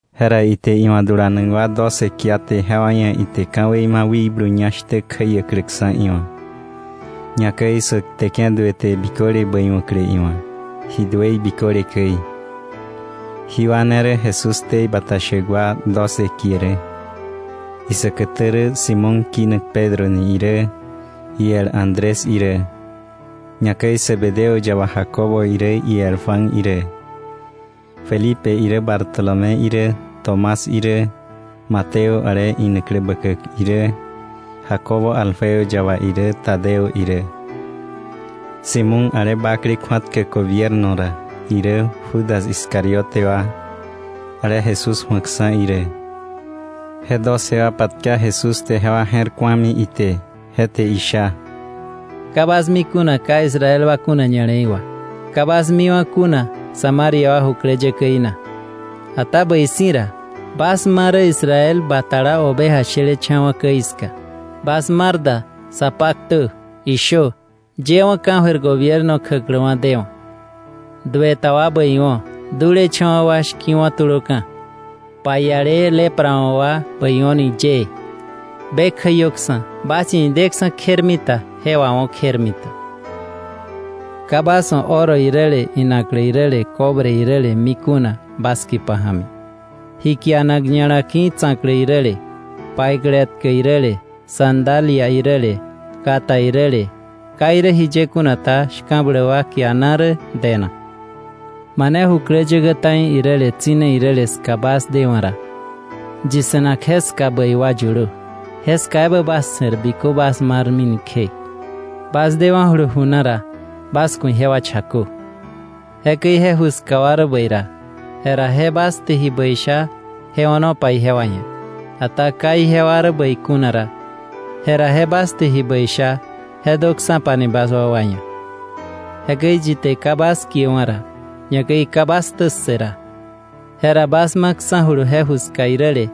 Jera ite iwa̱ dulanak wa doce kiaté, jewa ia̱ ite ka̱wei ma̱ wikblu ñá shtä kjäiäkläksa̱ iwa̱, ñakäi sä kteke̱ duë te biköle bäiwa̱klä iwa̱, ji duëi biköle käi. Jí wa ne rä Jesús ktei bata shäk wa doce kie rä: Isäkätä rä Simón kinak Pedro ni irä, iel Andrés irä; ñakäi Zebedeo yaba Jacobo irä, iel Juan irä; Felipe irä, Bartolomé irä, Tomás irä, Mateo ale inaklä bäkäk irä, Jacobo Alfeo yaba irä, Tadeo irä, Simón ale bakle kju̱atkäk gobierno ra irä, Judas Iscariote wa, ale Jesús ju̱akksa̱ irä. Je doce wa patka Jesús te, jewa je̱r ku̱ami ite, je te isha: “Ka bas mi kuna ka Israel wa kuna ña̱le̱i wà, ka bas miwa̱ kuna Samaria wa jukläyäkäí na, ata bäi si̱ ra, bas ma rä Israel batala oveja shelecha̱wa̱ käi ska. Bas mar da, sa paktö, ishö: Yëwa̱ ka̱jöir gobierno kjäkläwa̱ dewa̱. Due ta wa bäiwo̱, dulecha̱wa̱ wa shki̱wo̱ tulöka̱, paiale lepra wa̱ wa bäiwo̱ ni yëë, be kjäiöksa̱. Bas ia̱ ideksa̱ kjermita, je wawo̱ kjermita. “Ka bas wa̱ oro iräle inaklä iräle cobre iräle mi kuna bas kipa ja̱mi, ji kianak ña̱la ki̱ tsa̱klä iräle, paiklä etkä iräle, sandalia iräle, kata iräle. Ka irä jiye kuna ta, shka̱bläk wa kiana rä denak. “Mane jukläyäkä ta̱i iräle tsi̱ne iräle ska bas dewa̱ ra, yi se̱nak jeska bäi wa yulö, jeska ebä bas se̱r bikö bas marmi ni kje. Bas dewa̱julu ju na ra, bas ku̱ ijewa chakö. Jekäi je ju ska wa rä bäi ra, jera je bas te ji bäi sha, je o̱nopa ijewa ia̱, ata ka ijewa rä bäi kuna ra, jera je bas te ji bäi sha, je döksa̱pani bas wakwa ia̱. Jekäi yi te ka bas kiewa̱ ra, ñakäi ka bas ktä ssë ra, jera bas maksa̱julu je ju ska iräle,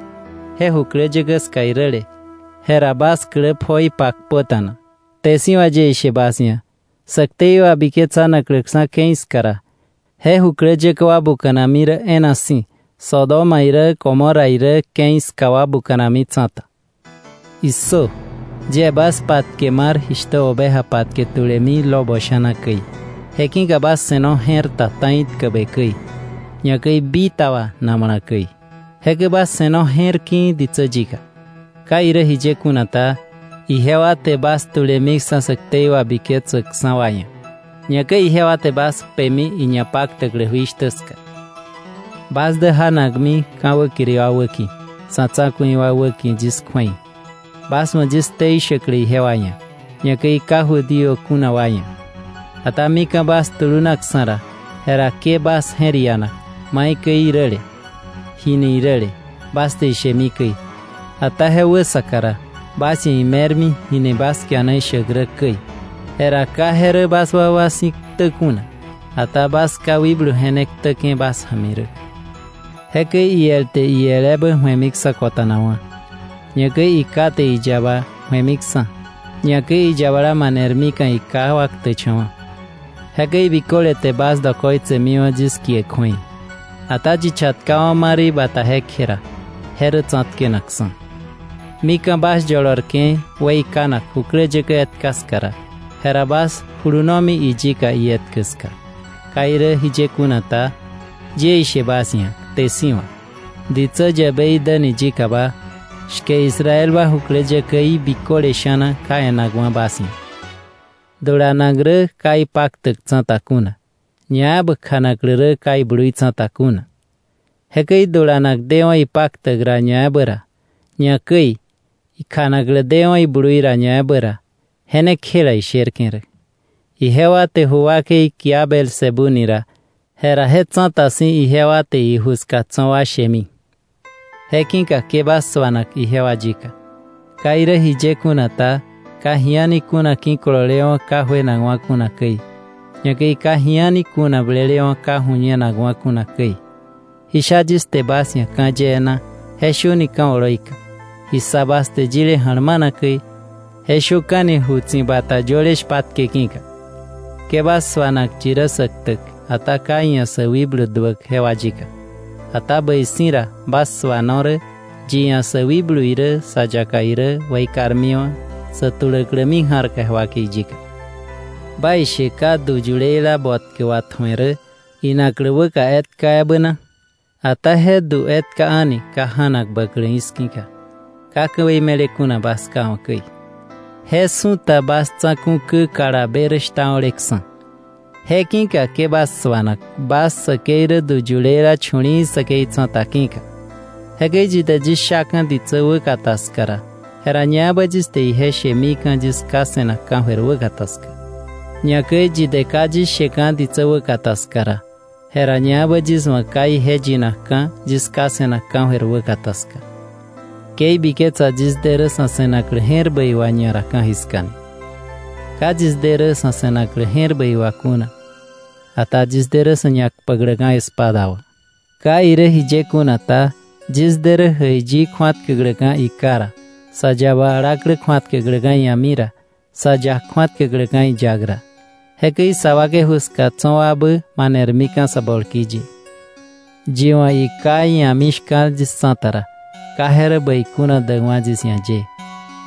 je jukläkläyä ska iräle, jera bas klä pjoi pakpöta̱na. Kte si̱ wà yie ishe bas ia̱, sä ktei wabiketsanakläksa̱ ke̱i ska ra, je jukläyäkä wa buka̱nami rä e̱e̱na si̱ Sodoma irä Gomorra irä ke̱i ska wa buka̱nami tsa̱ta. “¡Issö! Yie bas patke mar jishtä oveja patke tulemi lobo sha̱na käi. Je ki̱ka bas se̱no je̱r ta ta̱i tkäbe käi, ñakäi bitaba namala käi. Jekäi bas se̱no je̱r ki̱i̱ ditsä yika. Ka irä jiye kuna ta, ijewa te bas tulemiksa̱ sä ktei wabiketsäkksa̱ wa ia̱, ñakäi ijewa te bas kpemi iñapaktäklä jui shtä ska. Bas dä janakmi ka̱ wäkiri wa wäki̱, sa̱ tsa̱ku̱i wa wäki̱ yis kju̱ei, bas wa̱ yis ktei shäklä ijewa ia̱, ñakäi ka Judío kuna wa ia̱. Ata mika̱ bas tulunaksa̱ ra, jera ke bas je̱r ianak maikäi iräle, ji ni iräle bas te ishemi käi; ata je wäsaka ra bas ia̱ ime̱rmi jini bas kiana ishäk rä käi. Jera ka je rä bas wakwa si̱ ktä kuna, ata bas Ká wikblu je ne ktäke̱ bas ja̱mi rä. “Jekäi iel te iel ebä ju̱emiksa̱ kota̱nakwa̱; ñakäi iká te iyaba ju̱emiksa̱; ñakäi iyabala manermika̱ iká wa ktäkcha̱wa̱. Jekäi biköle te bas dokoitsemiwa̱ yis kie kju̱ei. Ata yi chatkawa̱ ma rä ibata jekje ra, je rä tsa̱tkenakksa̱. Mika̱ bas yolorke̱ weikanak jukläyäkä etka ska ra, jera bas julunomi iyika ietkä ska; ka irä jiye kuna ta, yie ishe bas ia̱ kte si̱ wà, ditsä yäbei däni yikaba, shke Israel wa jukläyäkäí biköle sha̱na ka e̱nakwa̱ bas ia̱. “Dulanak rä ka ipaktäk tsa̱ta kuna, ñaebä kjanaklä rä ka iblui tsa̱ta kuna. Jekäi dulanak dewa̱ ipaktäk ra ñaebä ra, ñakäi kjanaklä dewa̱ iblui ra ñaebä ra, je ne kjela isherke̱ rä. Ijewa te ju wakei kia Beelzebú ni ra, jera je tsa̱ta si̱ ijewa te iju ska tso̱ wa shemi. “Je ki̱ka ke bas suana ijewa yika. Ka irä jiye kuna ta, ka ji a̱ni kuna ki̱kololewa̱ ka juenakwa̱ kuna käi; ñakäi ka ji a̱ni kuna blelewa̱ ka ju̱ñenakwa̱ kuna käi. Ji sha yis te bas ia̱ ka̱ yee na, je shöni ka̱ oloi ka; ji ssa bas te yile ja̱lmana käi, je shöka̱ni ju tsi̱bata yöle shpatke ki̱ka. Ke bas suana yi rä sä ktäk, ata ka iia̱ sä wikblu duäk jewa yika. Ata bäi si̱ ra, bas suano rä yi ia̱ sä wikblu irä sa yaka irä weikarmiwa̱ sä tuläklämi ja̱rka je wakei yika. “¿Baishe ka du yuleila botkä watju̱e rä inaklä wäka etka ebä na? Ata je du etka a̱ni ka ja̱nak bäklä iski̱ka, ka ka̱wei me̱le kuna bas Ká wa̱ käi. Je su̱ta bas tsa̱ku̱ kä kalabe rä shtao̱leksa̱. Je ki̱ka ke bas suana; bas säkei rä du yuleila chu̱li̱i̱ säkei tsa̱ta ki̱ka. “Jekäi yi te yis shaka̱ ditsä wäkata ska ra, jera ñaebä yis te ije shemika̱ yis Ká se̱nak ka̱jöir wäkata ska. Ñakäi yi te ka yis sheka̱ ditsä wäkata ska ra, jera ñaebä yis wa̱ ka ije yinakka̱ yis Ká se̱nak ka̱jöir wäkata ska. “Ke ibiketsa yis de rä sa̱ se̱naklä je̱r bäi wà ñara ka̱jiska ni. Ka yis dene rä sa̱ se̱naklä je̱r bäi wà kuna, ata yis de rä sa̱ ñakpäkläka̱ espada wà. Ka irä jiye kuna ta, yis de rä jäiyi kju̱atkäkläka̱ iká ra, sä yaba alaklä kju̱atkäkläka̱ ia̱mi ra, sä yak kju̱atkäkläka̱ iyak ra. Jekäi sa wakei ju ska tso̱ wabä manermika̱ sä bolki ye. “Yi wa̱ iká ia̱mi shka̱l yis tsa̱ta ra, ka je rä bäi kuna däkwa̱ yis ia̱ ye;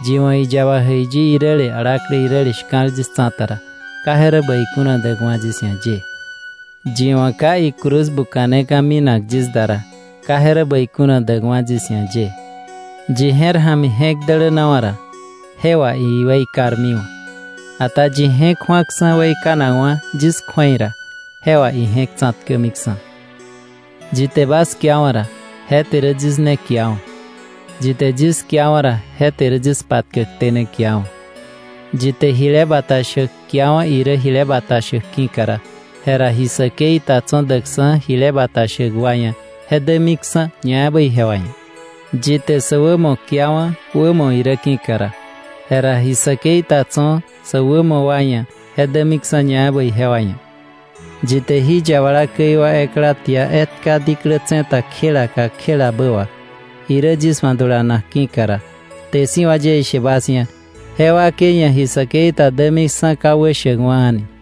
yi wa̱ iyaba jäiyi iräle, alaklä iräle shka̱l yis tsa̱ta ra, ka je rä bäi kuna däkwa̱ yis ia̱ ye; yi wa̱ ka icruz buka̱neka̱ minak yis da ra, ka je rä bäi kuna däkwa̱ yis ia̱ ye. Yi je̱r ja̱mi je̱k dälänawa̱ ra, je wà iweikarmiwa̱. Ata yi je̱k ju̱aksa̱ weikanakwa̱ yis kju̱ei ra, je wà ije̱k tsa̱tkämiksa̱. “Yi te bas kiawa̱ ra, je te rä yis ne kiawa̱; yi te yis kiawa̱ ra, je te rä yis patkäkté ne kiawa̱. Yi te jile bata shäk kiawa̱ irä jile bata shäk ki̱ka ra, jera ji säkei ta tso̱ däkksa̱ jile bata shäk wa ia̱ je dämiksa̱ ñaebä ijewa ia̱. Yi te sä wämo kiawa̱ wämo irä ki̱ka ra, jera ji säkei ta tso̱ sä wämo wa ia̱ je dämiksa̱ ñaebä ijewa ia̱. Yi te jí yabala käi wa ekla tia etka diklä tse̱ta kjela kakjelabä wà, irä yis wa̱ dulanak ki̱ka ra, kte si̱ wà yie ishe bas ia̱, je wakei ia̱ ji säkei ta dämiksa̱ ka wäshäkwa̱ a̱ni.”